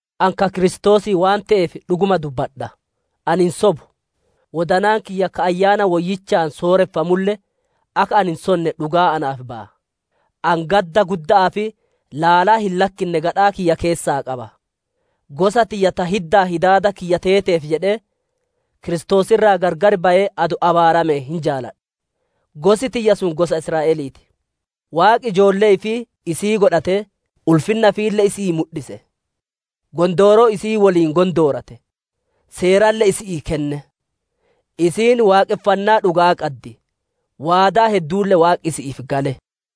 Ani ka Kiristoosii waan te'eef dhuguma dubbadha; ani hin sobu. Wodanaan kiyya ka Ayyaana Woyyichaan sooreffamulle, akka ani hin sonne dhugaa naaf baya. Ani gadda gudda'aa fi laalaa hin lakkinne gadhaa kiyya keessaa qaba. Gosa tiyya ta hiddaa hidaada kiyya teeteef jedhee, Kiristoos irraa gargar bayee adoo abaarame hin jaaladha. Gosi tiyya sun gosa Israa'elii ti; Waaqi ijoollee ifii isii godhatee, ulfinna ifiille isi'ii mudhise; gondooroo isii woliin gondoorate, Seeralle isi'ii kenne; isiin waaqonfannaa dhuga'aa qaddi; waadaa hedduulle Waaqi isi'iif gale;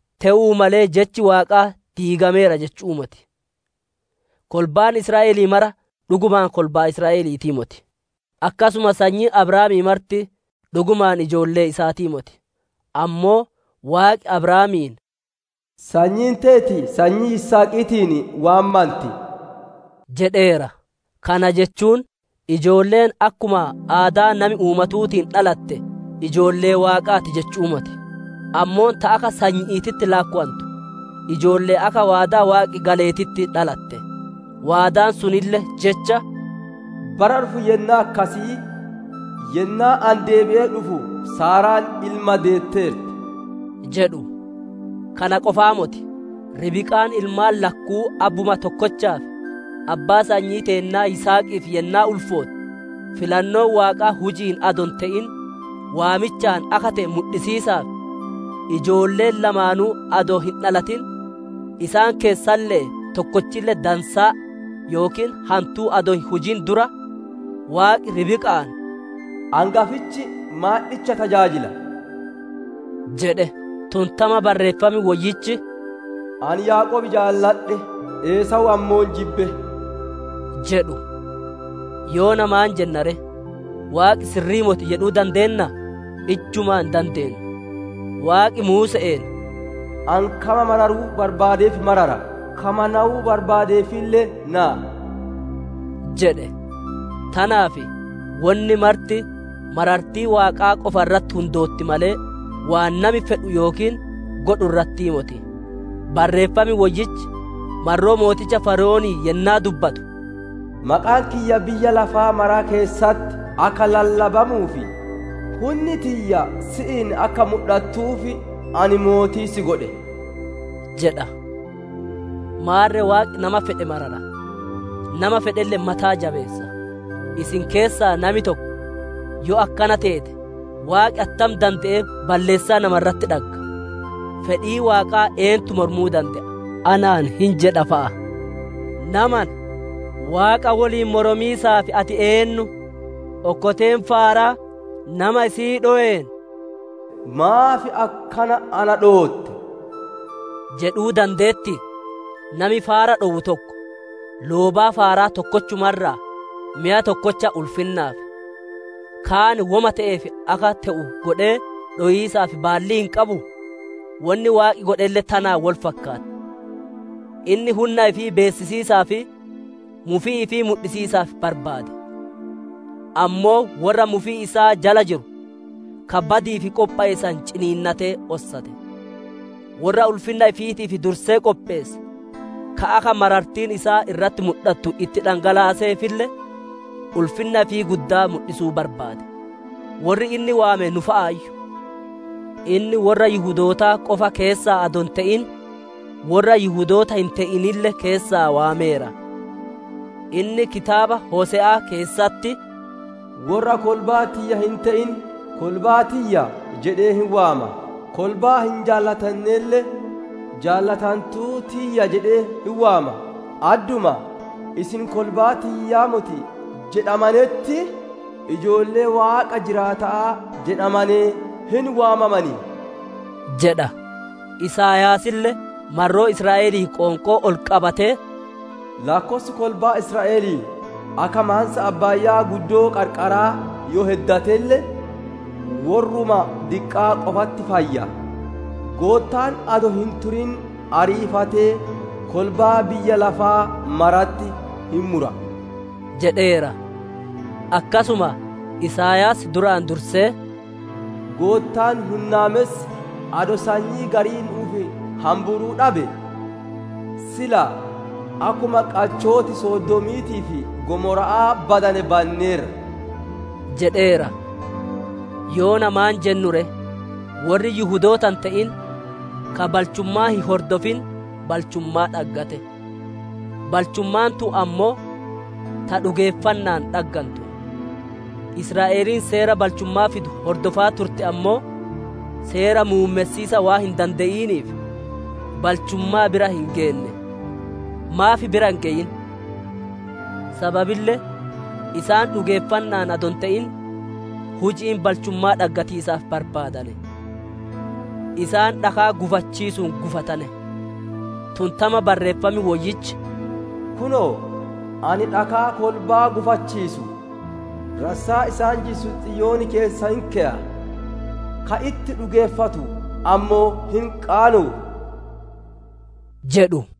Te'uu malee jechi Waaqaa diigameera jechu'uu moti; kolbaan Israa'elii mara dhugumaan kolbaa Israa'eliitii moti. Akkasuma sanyiin Abrahaamii marti dhugumaan ijoollee isaatii moti; ammoo, Waaqi Abrahaamiin, «Sanyiin teeti sanyii Yisihaqiitiin waammanti» jedheera. Kana jechuun ijoolleen akkuma aadaa nami uumatuutiin dhalatte ijoollee Waaqaati jechu'uu moti; ammoo ta akka sanyi'iititti laakkowantu, ijoollee akka waadaa Waaqi galeetitti dhalatte. Waadaan sunille jecha, «Bara dhufu yennaa akkasii yennaa ani deebi'ee dhufu, Saaraan ilma deetteerti» jedhu. Kana qofaa moti, Ribqaan ilmaan lakkuu abbuma tokkochaaf, abbaa sanyii teennaa Yisihaqiif yennaa ulfootte, filannoon Waaqaa huji'iin adoo hin te'in, waamichaan akka te'e mudhisiisaaf, ijoolleen lamaanuu adoo hin dhalatin, isaan keessalle'ee tokkolle dansaa yookiin hantuu adoo hin hujin dura, Waaqi Ribqa'aan, «Angafichi maandhicha tajaajila» jedhe. Tun tama Barreeffam Woyyichi, «Ani Yaaqoob jaaladhe, Esaawu ammoo jibbe» jedhu. Yoona maan jenna ree? Waaqi sirri'ii moti jedhuu dandeennaa? Ijjumaa hin dandeennu! Waaqi Muuse'een, «Ani kama mararuu barbaadeef marara; kama nawuu barbaadeefille naya» jedhe. Tanaaf, wonni marti marartii Waaqaa qofa irratti hundootti malee, waan nami fedhu yookiin godhu irrattii moti. Barreeffam Woyyichi, marroo mooticha Fara'oonii yennaa dubbatu, «Maqaan kiyya biyya lafaa mara keessatti akka lallabamuu fi hunni tiyya si'iin akka mudhattuuf ani mootii si godhe» jedha. Maarre Waaqi nama fedhe marara, nama fedhelle mataa jabeessa. Isin keessaa nami tokko, «Yoo akkana teete, Waaqi attam dande'ee balleessaa nama irratti dhagga? Fedhii Waaqaa eentu mormuu dande'a?» anaan hin jedha fa'a. Namana! Waaqa woliin moromiisaaf ati eennu? Okkoteen faaraa nama isii dhoween, «Maaf akkana na dhootte?» jedhuu dandeetti? Nami faara dhowu tokko, loobaa faaraa tokkochuma irraa, meya tokkocha ulfinnaaf, kaan woma te'eef akka te'u godhee dhowiisaaf baallii hin qabuu? Wonni Waaqi godhelle tanaan wol fakkaatti. Inni hunna ifii beessisiisaa fi mufii ifii mudhisiisaaf barbaade. Ammoo worra mufii isaa jala jiru, ka badi'iif qophowe san ciniinnatee ossate. Worra ulfinna ifiitiif dursee qopheesse, ka akka marartiin isaa irratti mudhattu itti dhangalaaseefille, ulfinna ifii guddaa mudhisuu barbaade. Worri inni waame nu fa'aayyu; inni worra Yihudootaa qofa keessaa adoo hin te'in, worra Yihudoota hin te'inille keessaa waameera. Inni kitaaba Hose'aa keessatti, «Worra kolbaa tiyya hin te'in, ‹Kolbaa tiyya› jedhee hin waama; kolbaa hin jaalatannelle, ‹Jaalatantuu tiyya› jedhee hin waama. Adduma, ‹Isin kolbaa tiyyaa moti› jedhamanetti, ‹Ijoollee Waaqa jiraata'aa› jedhamanee hin waamaman» jedha. Isaayaasille marroo Israa'elii qoonqoo ol qabatee, «Laakkossi kolbaa Israa'elii akka maansa abbaayaa qarqaraa yoo heddatelle, worruma diqqaa qofatti fayya; Goottaan adoo hin turin ariifatee kolbaa biyya lafaa maratti hin mura» jedheera. Akkasuma Isaayaas duraan dursee, «Goottaan Waan Mara Dade adoo sanyii garii nu'uuf hamburuu dhabe, sila akkuma qachooti Sodoomiitii fi Gomora'aa badane banneerra» jedheera. Yoona maan jennuu ree? Worri Yihudoota hin te'in, ka balchummaa hin hordofin, balchummaa dhaggate; balchummaan tun ammoo ta dhugeeffanna'aan dhaggantu. Israa'eliin Seera balchummaa fidu hordofaa turte ammoo, seera muummessiisa waan hin dande'iniif balchummaa bira hin geenne. Maaf bira hin geyin? Sababille isaan dhugeeffanna'aan adoo hin te'in, huji'iin balchummaa dhaggatiisaaf barbaadane. Isaan dhakaa gufachiisuun gufatane. Tun tama Barreeffam Woyyichi, «Kunoo, ani dhakaa kolbaa gufachiisu, rassaa isaan jissu Xiyoon keessa hin keya, ka itti dhugeeffatu ammoo hin qaanowu» jedhu.